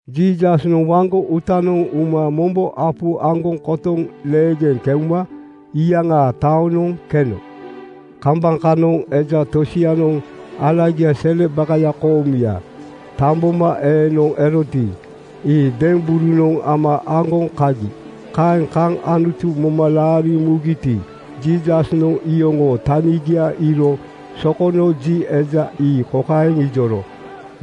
Jiisasnoŋ waŋgo uutanoŋ uma mombo apu aŋgoŋ kotoŋ leegeŋ keuma iyaŋaa taonoŋ keno. Kambaŋ kanoŋ eja tosianoŋ alagia sele bakaya koomuya tambomaeenoŋ eroti, ii demberunoŋ ama aŋgoŋ kagi. Kaeŋ kaŋ Anutu moma laariŋ mugiti, Jiisasnoŋ iyoŋoo tanigia iiro sokono ji eja ii kokaeŋ ijoro,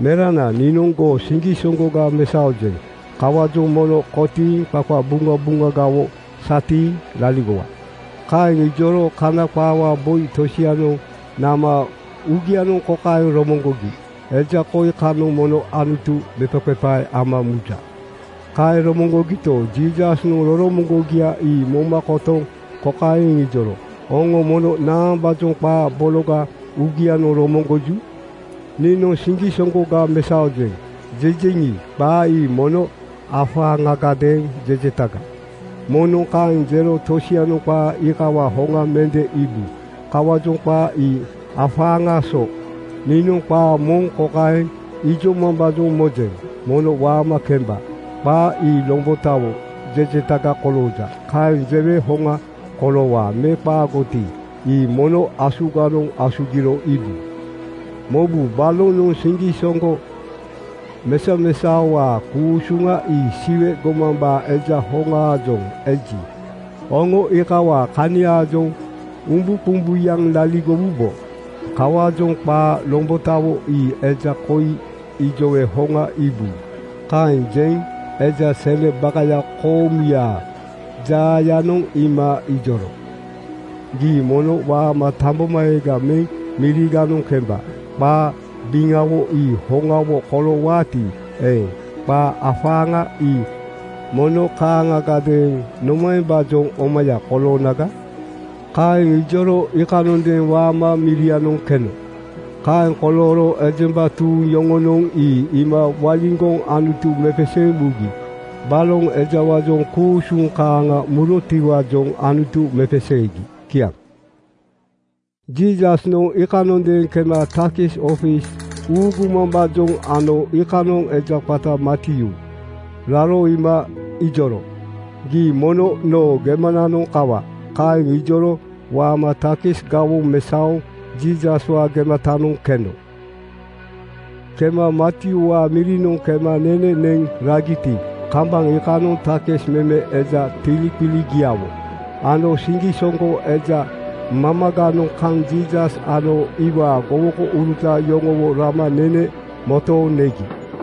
“Merana, niinoŋ goo siŋgisoŋgoga mesaojeŋ. Kawaajoŋ mono kotiiŋ qaqabuŋabuŋagawo satiiŋ laligowa.” Kaeŋ ijoro Kana qaawaa boi tosianoŋ nama uugianoŋ kokaeŋ romoŋgogi, “Eja koi kanoŋ mono Anutu mepaqepae ama muja.” Kaeŋ romoŋgogito, Jiisasnoŋ roromoŋgogia ii moma kotoŋ kokaeŋ iŋijoro, “Oŋo mono naambaajoŋ qaa bologa uugianoŋ romoŋgoju? Niinoŋ ‘Siŋgisoŋgoga mesaojeŋ,’ jejeŋi, qaa ii mono afaaŋagadeeŋ jejetaga. Moŋnoŋ kaeŋ jero tosianoŋ qaa iikawaa hoŋa mende iibu. Kawaajoŋ qaa ii afaaŋaa so. Niinoŋ qaa moŋ kokaeŋ ijomambaajoŋ mojeŋ, ‘Mono waama kemba.’ Qaa ii lombotawo jejetaga kolooja. Kaeŋ jewe hoŋa koloowaa me qaagoti, ii mono asuganoŋ asugiro iibu. Mobu, balonoŋ siŋgisoŋgo mesamesaowaa ku-usuŋa ii Siwe gomambaa Eja hoŋaajoŋ eji, oŋo iikawaa kaniaajoŋ umbuqumbuyaŋ laligowubo. Kawaajoŋ qaa lombotawo ii eja koi ijowe hoŋa iibu.” Kaeŋ jeŋ eja sele bakaya koomuyaa jaayanoŋ iima ijoro, “Gii mono waama tambomaeega meŋ miriganoŋ kemba. Qaa biŋawo ii hoŋawo koloowaati eeŋ, qaa afaaŋa ii mono kaaŋagadeeŋ nomaembaajoŋ omaya koloonaga?” Kaeŋ ijoro iikanondeeŋ waama mirianoŋ keno. Kaeŋ kolooro ejemba tuuŋ yoŋonoŋ ii iima waliŋgoŋ Anutu mepeseeŋ mugi. Baloŋ ejawaajoŋ ku-usuŋ kaaŋa murotiwaajoŋ Anutu mepeseegi. Kiaŋ. Jiisasnoŋ iikanondeeŋ kema takis ofis uugumambaajoŋ ano iikanoŋ eja qata Matyuu raro iima ijoro, “Gii mono noo gemananoŋ kawa.” Kaeŋ ijoro waama takis gawoŋ mesaoŋ Jiisaswaa gematanoŋ keno. Kema Matyuuwaa mirinoŋ kema nene neŋ ragiti, kambaŋ iikanoŋ takis meme eja tiliqiligiawo ano siŋgisoŋgo eja mamaganoŋ kaŋ Jiisas ano iwaa gowokouruta yoŋowo rama nene motooŋ negi.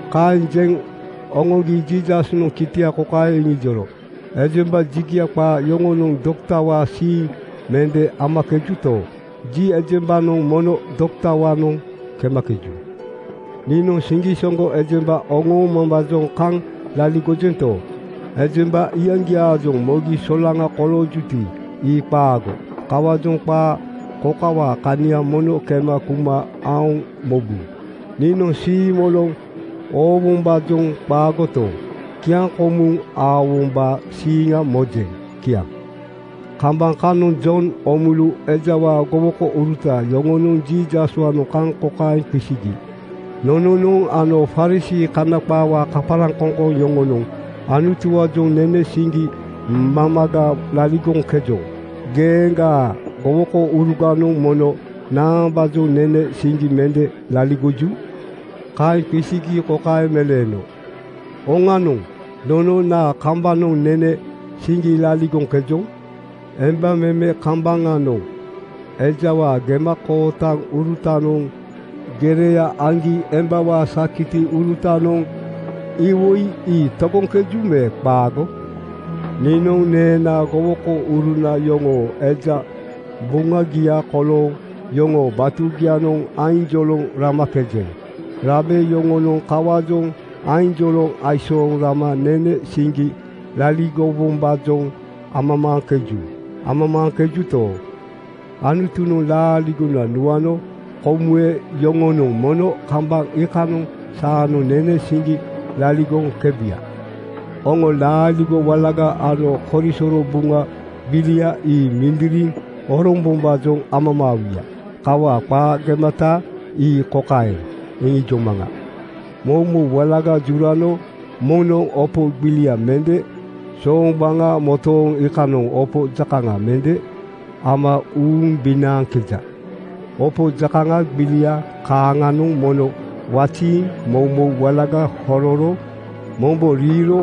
Kaeŋ jeŋ oŋoŋgi Jiisasnoŋ kitia kokaeŋ iŋijoro, “Ejemba jigia qaa yoŋonoŋ doktawaa siiŋ mende amakejuto, ji ejembanoŋ mono doktawaanoŋ kemakeju. Niinoŋ siŋgisoŋgo ejemba oŋoomambaajoŋ kaŋ laligojento, ejemba iyaŋgiaajoŋ mogi solaŋa koloojuti, ii qaago. Kawaajoŋ qaa kokawaa kania mono kema kuma aoŋ mobu, ‘Niinoŋ siimoloŋ oowombaajoŋ qaagoto, kiaŋkomuŋ aowombaa siiŋa mojeŋ.” ’ Kiaŋ. Kambaŋ kanoŋ Jon Oomulu ejawaa gowokouruta yoŋonoŋ Jiisaswaanoŋ kaŋ kokaeŋ qisigi, “Nononoŋ ano Farisii (Kana qaawaa kaparaŋkoŋkoŋ) yoŋonoŋ Anutuwaajoŋ nene siŋgi mamaga laligoŋkejoŋ. Geeŋgaa gowokouruganoŋ mono naambaajoŋ nene siŋgi mende laligoju?” Kaeŋ qisigi kokaeŋ meleeno, “Oŋanoŋ, nono naa kambanoŋ nene siŋgi laligoŋkejoŋ? Emba meme kambaŋanoŋ ejawaa gemakootaŋurutanoŋ gereya aŋgi embawaa sakitiurutanoŋ iwoi ii togoŋkeju me qaago? Niinoŋ neenaa gowokouruna yoŋoo eja buŋagia kolooŋ yoŋoo batugianoŋ ainjoloŋ ramakejeŋ. Rabe yoŋonoŋ kawaajoŋ ainjoloŋ aisooŋ rama nene siŋgi laligowombaajoŋ amamaaŋkeju. Amamaaŋkejuto, Anutunoŋ laaligona nuano komuwe yoŋonoŋ mono kambaŋ iikanoŋ saanoŋ nene siŋgi laligoŋkebuya. (Oŋo laaligo walaga ano korisoro Buŋa gbilia ii mindiriŋ orombombaajoŋ amamaawuya. Kawaa qaa gemata ii kokaeŋ iŋijomaŋa:) Moumou walaga jurano moŋnoŋ opo gbilia mende sooŋgbaŋa motoŋ iikanoŋ opo jakaŋa mende ama uumbinaaŋkeja. Opo jakaŋa gbilia kaaŋanoŋ mono waziiŋ moumou walaga hororo mombo riiro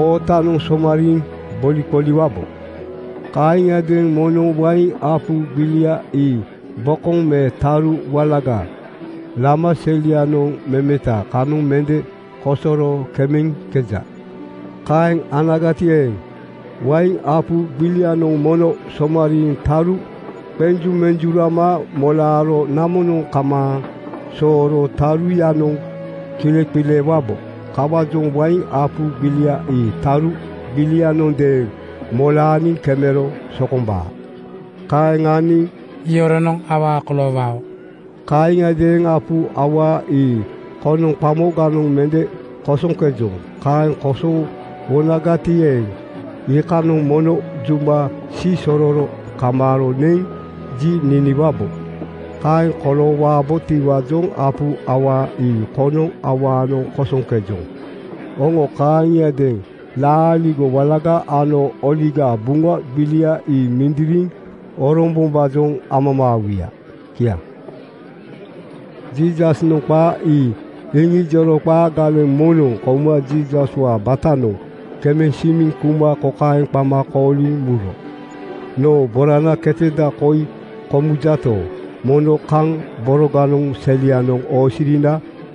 ootanoŋ somariiŋ boliqoliwabo. Kaaŋiadeeŋ moŋnoŋ wain apu gbilia ii bokoŋ me taru walaga lama selianoŋ memeta kanoŋ mende kosoro kemeŋkeja. Kaeŋ anagati eeŋ, wain apu gbilianoŋ mono somariiŋ taru qenjumenjurama molaaro namonoŋ kamaaŋ sooro taruyanoŋ kileqileewubo. Kawaajoŋ wain apu gbilia ii taru gbilianondeeŋ molaaniŋ kemero sokombaa. Kaeŋ aniŋ yoronoŋ awaa koloowao. (Kaaŋiadeeŋ apu awaa ii konoŋ qamoganoŋ mende kosoŋkejoŋ. Kaeŋ kosowonagati eeŋ, iikanoŋ mono juma siisororo kamaaro neŋ ji niniwabo. Kaeŋ koloowabotiwaajoŋ apu awaa ii konoŋ awaanoŋ kosoŋkejoŋ. Oŋo kaaŋiadeeŋ laaligo walaga ano Oligaa Buŋa gbilia ii mindiriŋ orombombaajoŋ amamaawuya.) Kiaŋ.” Jiisasnoŋ qaa ii iŋijoro qaa galeŋ moŋnoŋ kouma Jiisaswaa batanoŋ kemeŋ simiŋ kuma kokaeŋ qama kooliŋ muro, “Noo borana keteda koi komujato, mono kaŋ boroganoŋ selianoŋ oosirina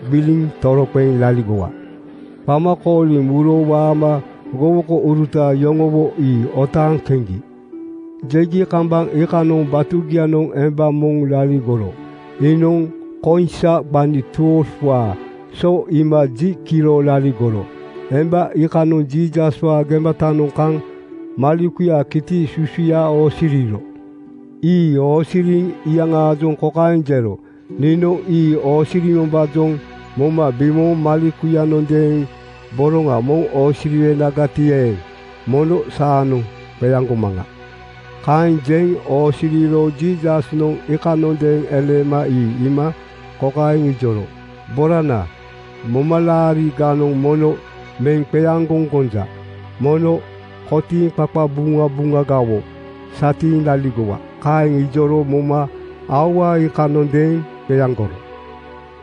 gbiliŋ toroqeŋ laligowa.” Qama kooliŋ muro waama gowokouruta yoŋowo ii otaaŋ keŋgi. Keŋgi kambaŋ iikanoŋ batugianoŋ emba moŋ laligoro. Iinoŋ koiŋsa gbani 12:waa so iima ji kiro laligoro. Emba iikanoŋ Jiisaswaa gematanoŋ kaŋ malekuyaa kiti susuya oosiriro. Ii oosiriŋ iyaŋaajoŋ kokaeŋ jero, “Niinoŋ ii oosirimambaajoŋ moma bimooŋ malekuyanondeeŋ boroŋa moŋ oosiriwenagati eeŋ, mono saanoŋ qeaŋgomaŋa.” Kaeŋ jeŋ oosiriro Jiisasnoŋ iikanondeeŋ eleema ii iima kokaeŋ ijoro, “Borana, momalaariganoŋ mono meŋ qeaŋgoŋ gonja. Mono kotiiŋ qaqabuŋabuŋagawo satiiŋ laligowa.” Kaeŋ ijoro moma aua iikanondeeŋ qeaŋgoro.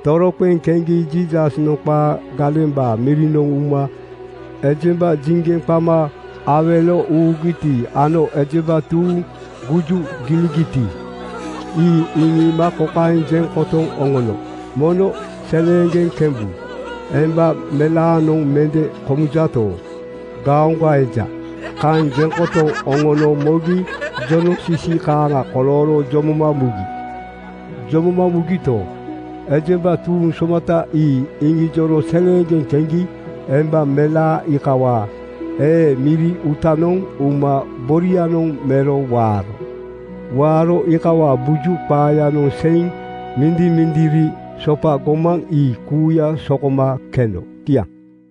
Toroqeŋ keŋgi Jiisasnoŋ qaa galembaa mirinoŋ uma ejemba jiŋgeŋ qama awelo uugiti ano ejemba tuuŋ guju giligiti, ii iŋiima kokaeŋ jeŋ kotoŋ oŋono, “Mono seleeŋgeŋ kembu. Emba melaanoŋ mende komujaato, gaoŋga eja.” Kaeŋ jeŋ kotoŋ oŋono mogi jonoŋsisi kaaŋa kolooro jomoma mugi. Jomoma mugito, ejemba tuuŋ somata ii iŋijoro seleeŋgeŋ keŋgi emba melaa iikawaa ee miri uutanoŋ uma borianoŋ mero waaro. Waaro iikawaa buju qaayanoŋ seiŋ mindimindiri sopa gomaŋ ii kuuya sokoma keno. Kiaŋ.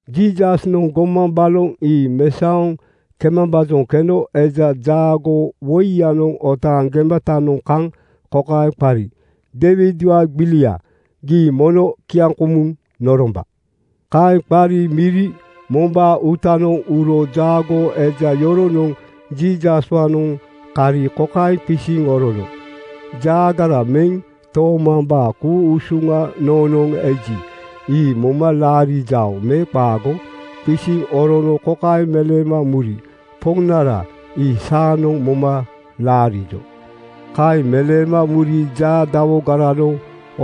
Jiisasnoŋ gomaŋ baloŋ ii mesaoŋ kemambaajoŋ keno eja jaagoo woiyanoŋ otaaŋ gematanoŋ kaŋ kokaeŋ qari, “Deiwidwaa gbilia, gii mono kiaŋkomuŋ noromba.” Kaeŋ qari miri mombaa uutanoŋ uro jaagoo eja yoronoŋ Jiisaswaanoŋ kari kokaeŋ qisiŋ orono, “Jaagara meŋ toomambaa ku-usuŋa noonoŋ eji, ii moma laarijao me qaago?” Qisiŋ orono kokaeŋ meleema muri, “Poŋnara, ii saanoŋ moma laarijo.” Kaeŋ meleema muri jaa dawogaranoŋ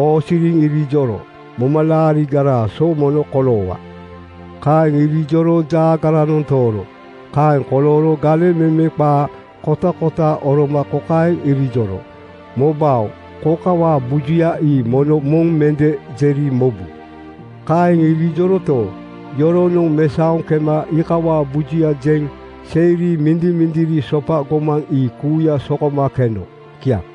oosiriŋ irijoro, “Momalaarigaraa so mono koloowa.” Kaeŋ irijoro jaagaranoŋ tooro. Kaeŋ kolooro galeŋ meme qaa kotakota oroma kokaeŋ irijoro, “Mobao, kokawaa bujuya ii mono moŋ mende jeri mobu.” Kaeŋ irijoroto, yoronoŋ mesaoŋ kema iikawaa bujuya jeŋ seiri mindimindiri sopa gomaŋ ii kuuya sokoma keno. Kiaŋ.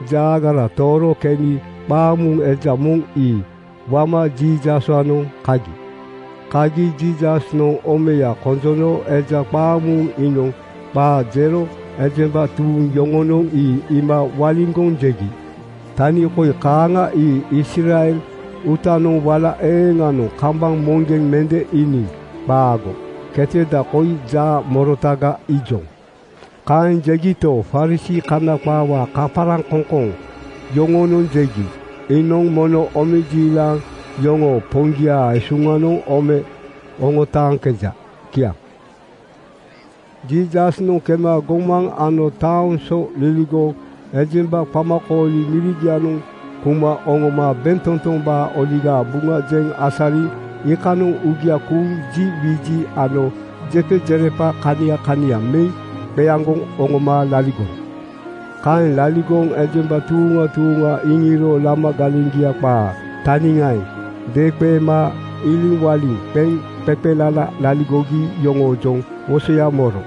Jaagara tooro keni qaamuuŋ eja moŋ ii wama Jiisaswaanoŋ kagi. Kagi Jiisasnoŋ omeya konjono eja qaamuuŋ iinoŋ qaa jero ejemba tuuŋ yoŋonoŋ ii iima waliŋgoŋ jegi, “Tani koi kaaŋa ii Israel uutanoŋ wala eeŋanoŋ kambaŋ moŋgeŋ mende iiniŋ. Qaago. Keteda koi jaa morotaga iijoŋ.” Kaeŋ jegito, Farisii (Kana qaawaa kaparaŋkoŋkoŋ) yoŋonoŋ jegi, “Iinoŋ mono omejiilaŋ yoŋoo poŋgiaa esuŋanoŋ ome oŋotaaŋkeja.” Kiaŋ. Jiisasnoŋ kema gomaŋ ano taoŋ so liligoŋ ejemba qamakooli mirigianoŋ kuma oŋoma bentotombaa Oligaa Buŋa jeŋ asariŋ iikanoŋ uugia kuuŋ ji wiji ano jepajerepa kania kania meŋ qeaŋgoŋ oŋoma laligoro. Kaeŋ laligoŋ ejemba tuuŋa tuuŋa iŋiiro lama galeŋgia qaa taniŋaeŋ deeŋqeema iliŋwaliŋ qeŋ qeqelala laligogi yoŋoojoŋ wosoya moro.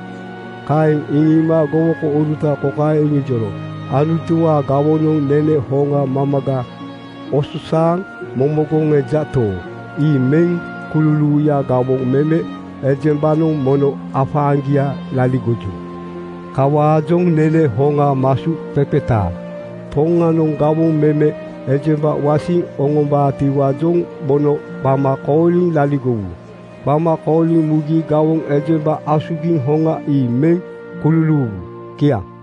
Kaeŋ iŋiima gowokouruta kokaeŋ iŋijoro, “Anutuwaa gawonoŋ nene hoŋa mamaga osasaaŋ momogoŋ ejato, ii meŋ kululuuyaa gawoŋ meme ejembanoŋ mono afaaŋgia laligoju. Kawaajoŋ nene hoŋa masuqeqetaa Poŋanoŋ gawoŋ meme ejemba wasiŋ oŋombaatiwaajoŋ mono qama kooliŋ laligowu. Qama kooliŋ mugi gawoŋ ejemba asugiŋ hoŋa ii meŋ kululuuwu.” Kiaŋ.